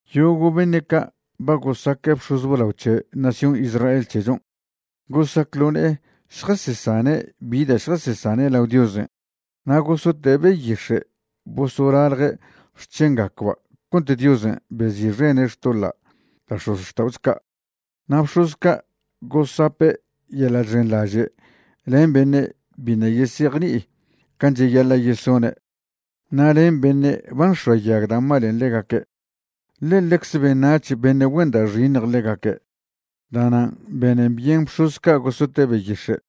Yogo' beṉe' ca' ba gosaque' bx̱oz blao c̱he nación Israel c̱hechon' gosac ḻo ne'e šjasesane' bi da' šjasesane' lao Diosen' na' gosote' beyix̱e' bosolalje' xc̱hengacba' cont Diosen' bezi'xene' xtoḻa' da' x̱ozxta'ocho ca'. Na' bx̱oz ca' gosape' yeḻa' chxenḻaže' len beṉe' biṉa' yesejni'i can' cheyaḻa' yesone' na' len beṉe' ba nx̱oayag da' malen' ḻegaque', ḻe ḻecze beṉac̱h beṉe' güen da' xiṉj ḻegaque'. Da'nan' benen byen bx̱oz ca' gosote' beyix̱e'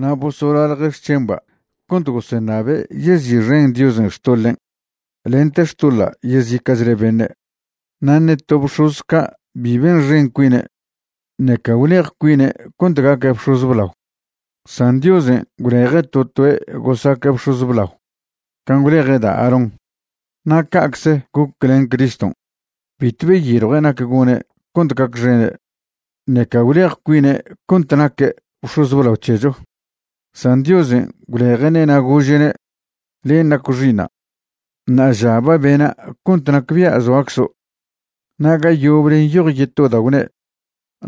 na' bosolalje' xc̱hemba' cont goseṉabe' yezi'xen Diosen' xtoḻen' lente xtoḻa' yezica'chle beṉe'. Na' ṉe to bx̱oz ca' bi benxen cuine' ṉeca gwlej cuine' cont gaque' bx̱oz blao, san Diosen' gwleje' to toe' gosaque' bx̱oz blao can' gwleje' da' Aarón. Na' ca'cze goc len Criston', bitw beyiljue' nac gone' cont gacxene', ṉeca gwlej cuine' cont naque' bx̱oz blao c̱hecho, san Diosen' gwleje'ne' na' gože'ne': Len' naco' Xi'iṉa', ṉa'aža ba bena' cont nacbia' zoaczo'. Na' ga yoble nyoj yeto da' gwne':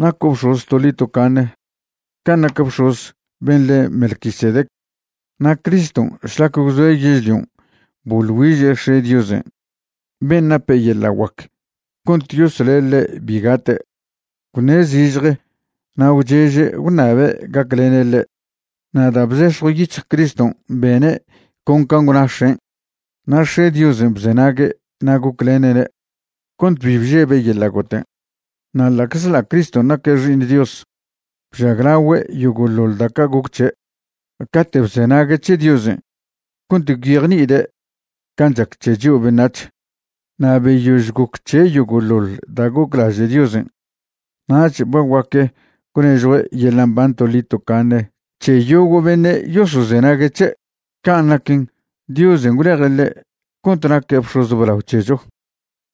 Naco' bx̱oz toḻi tocaṉe can' nac bx̱oz ben' le' Melquisedec. Na' Criston' šlac gwzoe' yežlion' boḻ güiže' X̱e' Diosen' ben' nape' yeḻa' guac cont yosle' ḻe' bi gate', gwṉe' zižje na' gwcheže' gwṉabe' gaclene' ḻe'. Na' da' bzex̱jw yic̱hj Criston' bene' con can' gwna X̱en', na' X̱e' Diosen' bzenague' na' goclene'ne' cont bi bžebe' yeḻa' goten'. Na' ḻa'czḻa' Criston' naque' Xi'iṉ Dios, bžaglagüe' yogo'ḻoḻ da' ca' goc c̱he' cate' bzenague' c̱he Diosen' cont gwyejni'ide' can' chac c̱he chio' beṉac̱h. Na' beyož goc c̱he' yogo'ḻoḻ da' goclaže' Diosen', nach ba guaque' gwnežjue' yeḻa' mban toḻi tocaṉe c̱he yogo' beṉe' yosozenague' c̱he'. Can' naquen, Diosen' gwleje' ḻe' cont naque' bx̱oz blao c̱hecho,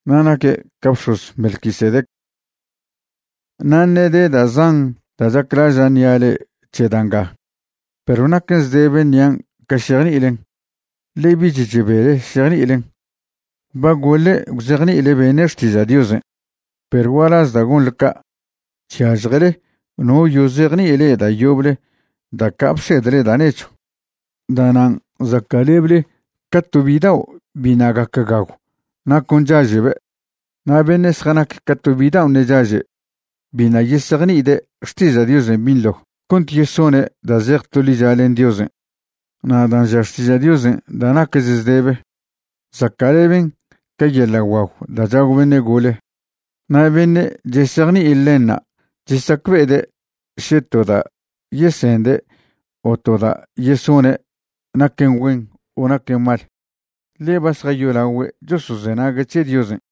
na' naque' ca bx̱oz Melquisedec. Na' ṉe' de da' zan da' chaclaža' ṉia' le'e c̱he da' ngan', perw naquen zdebe ṉian' ca šejni'ilen, ḻe bich chebele šejni'ilen. Ba goḻe' gwzejni'ile beṉe' xtiža' Diosen', perw gualaz da' gonḻe ca', chyažjele no yozejni'i le'e da' yoble da' ca' bsedle da' nechw. Da'nan' zaca'leble ca to bidao' biṉa' gac gagw na' con chaže'be'. Na' beṉe' zjanac ca to bidao' ṉe' chaže', biṉa' yesejni'ide' xtiža' Diosen' binḻo cont yesone' da' zej to licha len Diosen'. Na' dan' ža xtiža' Diosen' da' naquech zdebe, zaca'leben ca yeḻa' guagw da' chagw beṉe' gole. Na' beṉe' chesejni'i ḻenṉa' chesacbe'ede' še to da' yesende' o to da' yesone' naquen güen o naquen mal, ḻe ba zjayolagüe' chosozenague' c̱he Diosen'.